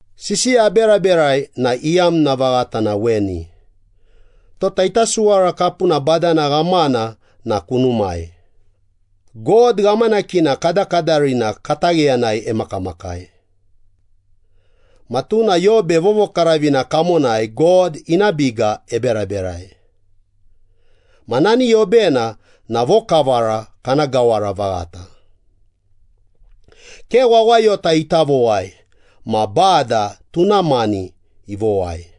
Sisiya aberaberai na iyamna vaghata na weni. Tota ita suwara kapuna badana ghamana na kunumai, God ghamanakina kadakadarina katagheyanai emakamakai. Ma tuna yobe vovokaravina kamonai God ina biga eberaberai. Ma nani yobena na vokavara kana gawara vaghata. Ke wawayota ita vowai ma Bada tuna mani ivowai.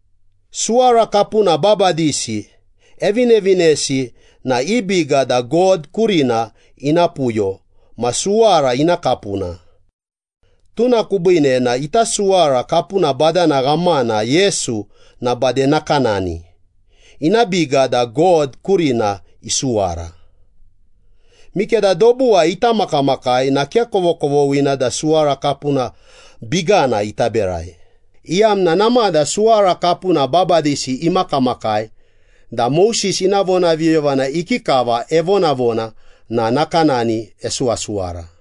Suwara kapuna babadisi evinevinesi na i biga da God kurina ina puyo ma suwara ina kapuna. Tuna kubiine na ita suwara kapuna badana ghamana Yesu na bade nakanani, ina biga da God kurina isuwara. Mikeda dobuwai ita makamakai na ke kovokovoghina da suwara kapuna bigana ita berai, iyamna namada suwara kapuna babadisi imakamakai da Moses ina vonaviyoyovana ikikava evonavona na nakanani esuwasuwara.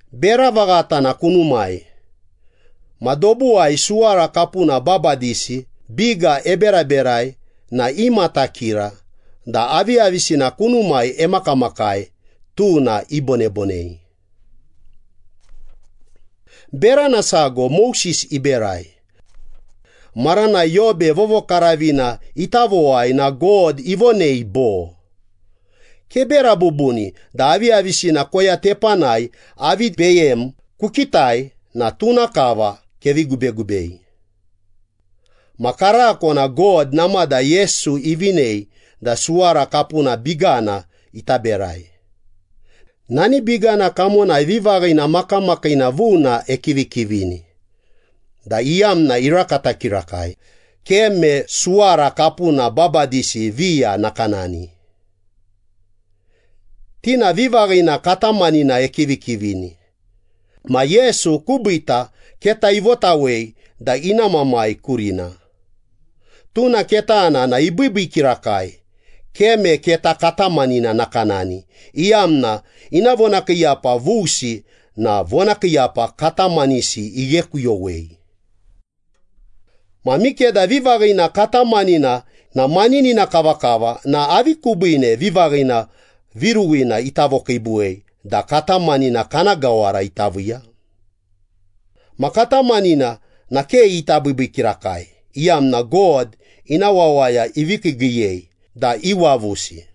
Bera vaghata na kunumai. Ma dobuwai suwara kapuna babadisi biga eberaberai na imatakira da aviyavisina kunumai emakamakai, tuna ibonebonei. Berana sago Moses iberai. Maranai yobe vovokaravina ita vowai na God ivonei bo, “Kebera bubuni da aviyavisina koya tepanai avi beyem kukitai na tuna kava kevi gubegubei.” Ma karako na God namada Yesu ivinei da suwara kapuna bigana ita berai. Nani bigana kamonai vivaghina makamakiina vuna ekivikivini da iyamna irakata kirakai, ke me suwara kapuna babadisi viya nakanani. Ti na vivaghina katamanina ekivikivini. Ma Yesu kubiita keta ivotawei da ina Mamai kurina. Tuna ketana na ibiibii kirakai, ke me keta katamanina nakanani, iyamna ina vonakiiyapa vusi na vonakiiyapa katamanisi ighekuyowei. Ma mikeda vivaghina katamanina na maninina kavakava na avi kubiine vivaghina viruwina ita vokiibuwei da katamanina kana gawara ita viiya? Ma katamanina na ke ita biibii kirakai, iyamna God ina wawaya ivi kiigiiyei da iwavusi.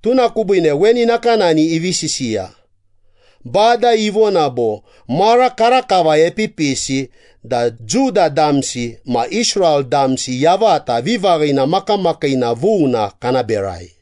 Tuna kubiine weni nakanani ivi sisiya, “Bada ivona bo, ‘Mara karakava epipisi da Juda damsi ma Israel damsi yavata vivaghina makamakiina vuna kana berai.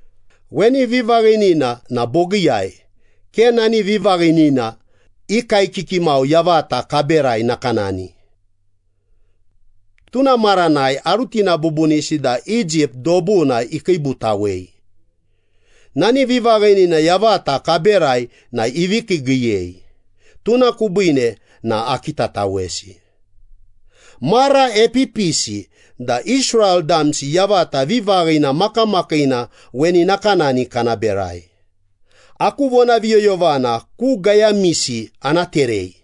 Weni vivaghinina na bogiiyai, ke nani vivaghinina i kaekiki mau yavata kaberai nakanani. Tuna maranai arutina bubunisi da Egypt dobuna ikiibutawei. Nani vivaghinina yavata kaberai na ivi kiigiiyei, tuna kubiine na akitatawesi.’ ‘Mara epipisi da Israel damsi yavata vivaghina makamakiina weni nakanani kana berai, Aku vonaviyoyovana ku gayamisi ana terei,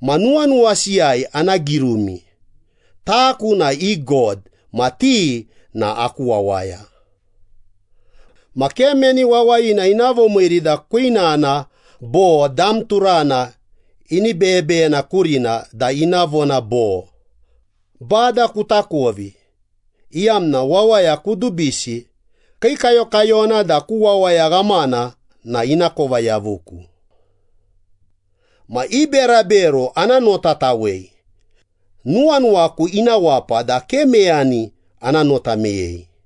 ma nuwanuwasiyai ana girumi. Taku na i God, ma ti na aku wawaya.’ Ma ke meni wawayina ina vomiiri da kwinana bo dam turana ini beyebeyena kurina da ina vona bo, ‘Bada kutakovi,’ Iyamna wawaya kudubisi, Kiikayokayona da ku wawaya ghamana na inakova yavuku. Ma i berabero ana notatawei, nuwanuwaku ina wapa da ke meyani ana nota meyei.”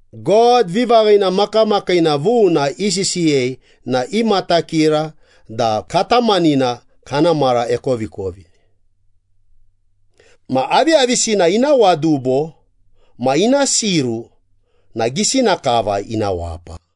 God vivaghina makamakiina vuna isisiyei na imatakira da katamanina kana mara ekovikovi. Ma aviyavisina ina wadubo ma ina siru na gisina kava ina wapa.